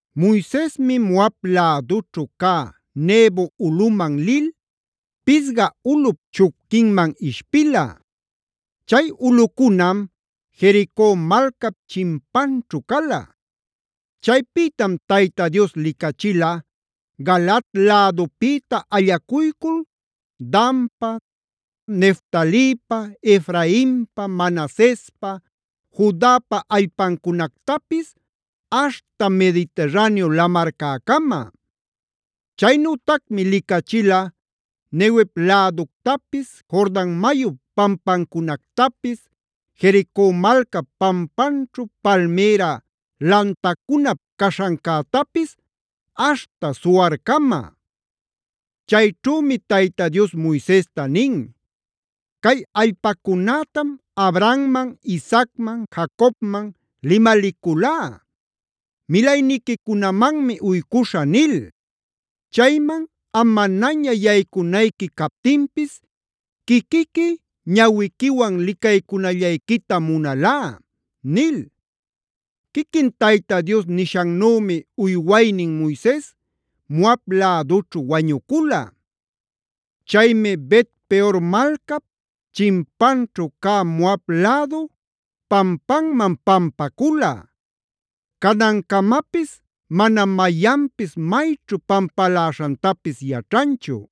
Moisesmi Moab lädućhu cä Nebo ulꞌuman lil Pisga ulꞌup chupquinman ishpila. Chay ulꞌucunam Jerico malcap chimpanćhu cala. Chaypïtam Tayta Dios licachila Galaad lädupïta allacuycul Danpa, Neftalipa, Efrainpa, Manasespa, Judapa allpancunactapis aśhta Mediterraneo lamarcäcama. Chaynütacmi licachila Neguev läductapis, Jordan mayup pampancunactapis, Jerico malcap pampanćhu palmïra lantacunap caśhancätapis aśhta Zoarcama. Chayćhümi Tayta Dios Moisesta nin: “Cay allpacunätam Abrahamman,a Isaacman,b Jacobmanc limaliculá: ‘Milayniquicunamanmi uycuśhä’ nil. Chayman am manaña yaycunayqui captinpis quiquiqui ñawiquiwan licaycunallayquitam munalá” nil. Quiquin Tayta Dios nishannümi uywaynin Moises Moab lädućhu wañucula. Chaymi Bet-peor malcap chimpanćhu cä Moab lädu pampanman pampacula; canancamapis manam mayanpis mayćhu pampaläśhantapis yaćhanchu.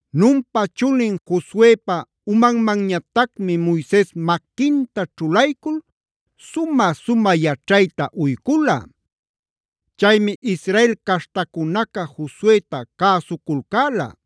Nunpa chulin Josuepa umanmanñatacmi Moises maquinta ćhulaycul sumä-sumä yaćhayta uycula. Chaymi Israel caśhtacunaca Josueta cäsuculcäla;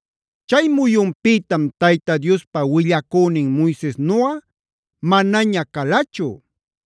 Chay muyunpïtam Tayta Diospa willacünin Moisesnuꞌa manaña calachu.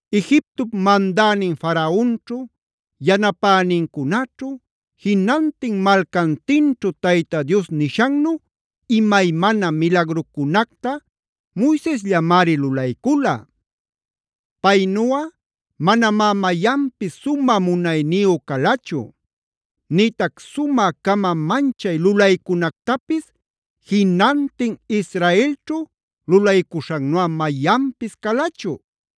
Egiptop mandänin Faraonćhu, yanapänincunaćhu, jinantin malcantinćhu Tayta Dios nishannu imaymana milagrucunacta Moisesllamari lulaycula. Paynuꞌa manamá mayanpis sumä munayniyu calachu; nïtac sumä-cama manchay lulaycunactapis jinantin Israelćhu lulaycuśhannuꞌa mayanpis calachu.